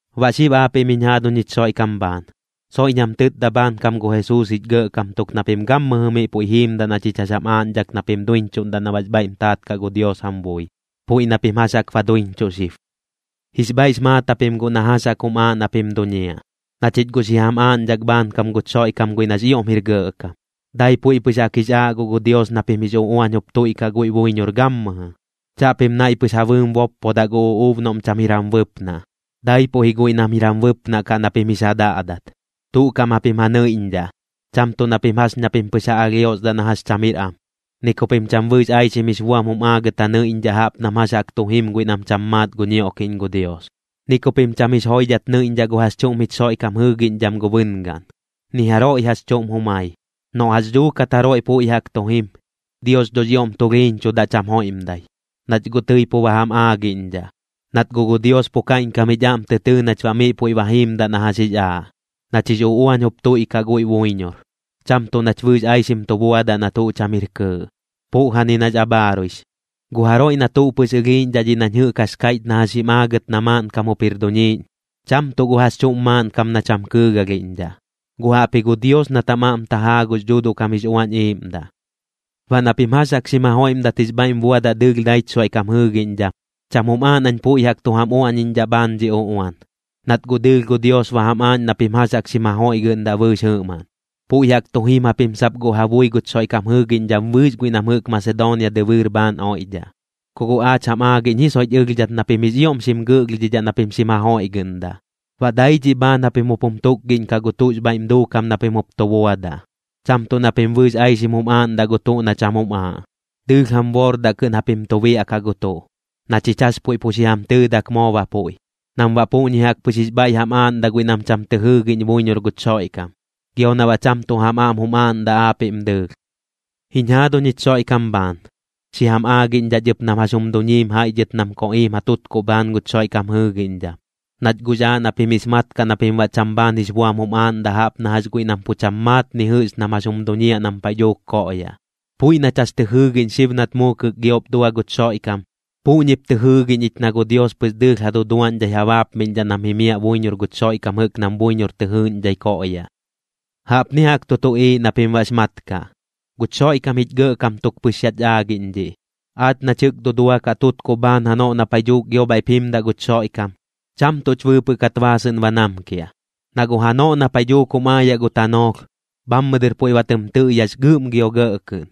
Baꞌ xib aapiꞌm jiñ jaaduñ jich Xoiꞌkam bhaan, soiꞌñ jam tɨtda bhaankam gu Jesuus jich Gɇꞌkam tuk na pim gammɨjɨ miꞌ puiꞌ jiimdaꞌ na chich jax jam aaꞌñdhak na pim duiñchuꞌndaꞌ na baꞌx bhaiꞌm taat kaꞌ gu Dios jam bui, puiꞌ na pim jax jaꞌk ba duiñchuꞌ xib. Jix bhaiꞌx maat japim guꞌ na jax jaꞌk jum aaꞌ na pim duñiaꞌ, na chich guꞌ xi jam aaꞌñdhak bhaankam guch Xoiꞌkam guiꞌ nax ioꞌm jir gɇꞌkam. Dai puiꞌ pɨx jaꞌk jix aaꞌ guꞌ gu Dios na pim jix uꞌuañ jup tuiꞌkaꞌ guiꞌ buiñor gammɨjɨ. Chaꞌpim naiꞌ pɨx ja bɨɨm boppodaꞌ gu uꞌuub noꞌm cham jir jam bɨpnaꞌ, daipuꞌ ji guiꞌ nam jir jam bɨpnaꞌ kaꞌ na pim jix ja daꞌdat. Tuꞌ kaꞌm japim ja nɨiꞌñdhaꞌ, cham tuꞌ na pim jax ña pim pɨx ja alhiosdaꞌ na jax cham jir am. Ni ku pim cham bɨɨx aixim jix buam jum aagɨt ja nɨiꞌñdhaꞌ jaꞌp nam jax jaꞌk tu jim guiꞌ nam cham maat gu ñioꞌkiꞌñ gu Dios. Ni ku pim cham jix joidhat nɨiꞌñdhaꞌ gu jax chuꞌm jich Xoiꞌkam jɨɨgiꞌñdham gu bɨngaꞌn, ni jaroiꞌ jax chuꞌm jumai. Noꞌ jax dhuukat jaroiꞌ puiꞌ jaꞌk tu jim, Dios dhox ioꞌm tulhiiñchudaꞌ cham joiꞌmdai, nach guꞌ tɨi pu ba jam aagiꞌñdhaꞌ. Nat guꞌ gu Dios pu kaiꞌñkam jich aꞌm tɨ tɨɨ nach baꞌ miꞌ puiꞌ ba jiimdaꞌ na jax jix aaꞌ, nach jix uꞌuañ jup tuiꞌkaꞌ guiꞌ buiñor, cham tuꞌ nach bɨɨx aixim tu buadaꞌ na tuꞌ cham jir kɨɨꞌ. Puꞌjani nax abhaaruix. Gu jaroiꞌ na tuꞌ pɨx ɨlhiiꞌñdhaꞌ dhiꞌ nañ jɨꞌk jax kaiꞌch na jax jim aagɨt na maaꞌnkam jup jir duniiꞌñ, cham tuꞌ gu jax chuꞌm maaꞌnkam na cham kɨɨgalhiꞌñdhaꞌ, guꞌ jaꞌpji gu Dios nat jam aꞌm tajaa gux Dhuuduꞌ kam jix Uañ Iiꞌmdaꞌ. Baꞌ na pim jax jaꞌk xim jajoiꞌmdat jix bhaiꞌm buadaꞌ dɨɨlh daich Xoiꞌkam jɨɨgiꞌñdham, cham jum aaꞌ nañ puiꞌ jaꞌk tu jam uaꞌñiꞌñdhaꞌ bhaan dhi uꞌuan, nat guꞌ dɨɨlh gu Dios ba jam aaꞌñ na pim jax jaꞌk xim jajoiꞌgɨꞌndaꞌ bɨɨx jɨꞌmaꞌn. Puiꞌ jaꞌk tu jim japim sap guꞌ ja bui guch Xoiꞌkam jɨɨgiꞌñdham bɨɨx guiꞌ nam jɨꞌk Masedoonia dɨbɨɨr bhaan oiꞌdhaꞌ, ku guꞌ aach jam aagiꞌñ ji soiꞌch ɨlhdhat na pim jix ioꞌm xim gɨꞌlhdhidhaꞌ na pim xim jajoiꞌgɨꞌndaꞌ. Baꞌ dai dhiꞌ bhaan japim jup jum tukgiꞌñkaꞌ gu tuꞌx bhaiꞌm duukam na pim jup tu buadaꞌ, cham tuꞌ na pim bɨɨx aixim jum aaꞌndaꞌ gu tuꞌ na cham jum aaꞌ. Dɨɨlh jam boordaꞌ kɨꞌn japim tu biaꞌkaꞌ gu tuꞌ, na chich jax puiꞌ pu xi jam tɨɨdak moo ba puiꞌ, nam baꞌ puꞌñi jaꞌk pɨx jix bhaiꞌ jam aaꞌndaꞌ guiꞌ nam cham tɨ jɨɨgiꞌñ buiñor guch Xoiꞌkam, gio na baꞌ cham tuꞌ jam aꞌm jum aaꞌndaꞌ aapiꞌm dɨɨlh. Jiñ jaaduñ jich Xoiꞌkam bhaan, xi jam aagiꞌñdhaꞌch ɨp nam jax jum duñiim jaiꞌ dhɨt nam koꞌiim ja tutkuꞌ bhaan guch Xoiꞌkam jɨɨgiꞌñdham, nach guꞌx aaꞌ na pim jix mat kaꞌ na pim baꞌ cham bhaan jix buam jum aaꞌndaꞌ jaꞌp na jax guiꞌ nam pu cham maat ni jɨꞌx nam jax jum duñiaꞌ nam paiꞌ dhuuk koꞌyaꞌ. Puiꞌ nach jax tɨ jɨɨgiꞌñ xib nat muukɨk giop dua guch Xoiꞌkam, puꞌñip tɨ jɨɨgiꞌñ ich na gu Dios pɨx dɨɨlh ja duduaꞌñdhai ja baapmiꞌñdhaꞌ nam jimiaꞌ buiñor guch Xoiꞌkam jɨꞌk nam buiñor tɨ jɨɨꞌñdhai koꞌyaꞌ. Jaꞌpni jaꞌk tu tuꞌiiꞌ na pim baꞌx mat kaꞌ, guch Xoiꞌkam jich Gɇꞌkam tuk pɨx yaꞌch aagiꞌñ dhiꞌ. Aach nach jɨꞌk duduakaꞌ tutkuꞌ bhaan janoꞌ na paiꞌ dhuuk gio bhaiꞌp jimdaꞌ guch Xoiꞌkam, cham tuꞌch bɨɨpɨꞌ kat baasɨꞌn namkiaꞌ. Na guꞌ janoꞌ na paiꞌ dhuuk jum aayaꞌ gu tanoolh, bhammɨ dɨr puiꞌ ba tɨm tɨꞌyaꞌx gɨꞌm kɨꞌn gio gɇꞌ kɨꞌn.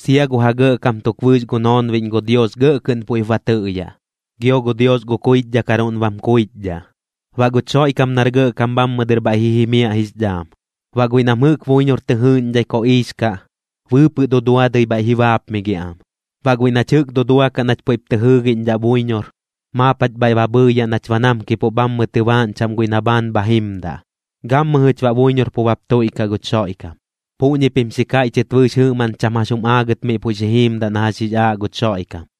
Sia gu ja gɇꞌkam tuk bɨɨx gu noonbiꞌñ gu Dios gɇꞌ kɨꞌn puiꞌp ba tɨꞌyaꞌ, gio gu Dios gu kuichdhakaruꞌn bam kuichdhaꞌ. Baꞌ guch Xoiꞌkam nar Gɇꞌkam bhammɨ dɨr bhaiꞌ ji jimiaꞌ jix dhaam, baꞌ guiꞌ nam jɨꞌk buiñor tɨ jɨɨꞌñdhai koꞌiix kaꞌ, bɨɨpɨꞌ duduadɨi bhaiꞌ ji baapmigiaꞌ am. Baꞌ guiꞌ nach jɨꞌk duduakaꞌ nach puiꞌp tɨ jɨɨgiꞌñdhaꞌ buiñor, maap jach bhaiꞌ ba bhɨɨyaꞌ nach ba namkipuꞌ bhammɨ tɨbaaꞌñ chaꞌm guiꞌ na bhaan bha jimdaꞌ, gammɨjɨch baꞌ buiñor pu bap tuiꞌkaꞌ guch Xoiꞌkam. Puꞌñi pim xi kaiꞌchɨt bɨɨx jɨꞌmaꞌn cham jax jum aagɨt miꞌ puiꞌ xi jiimdaꞌ na jax jix aaꞌ guch Xoiꞌkam.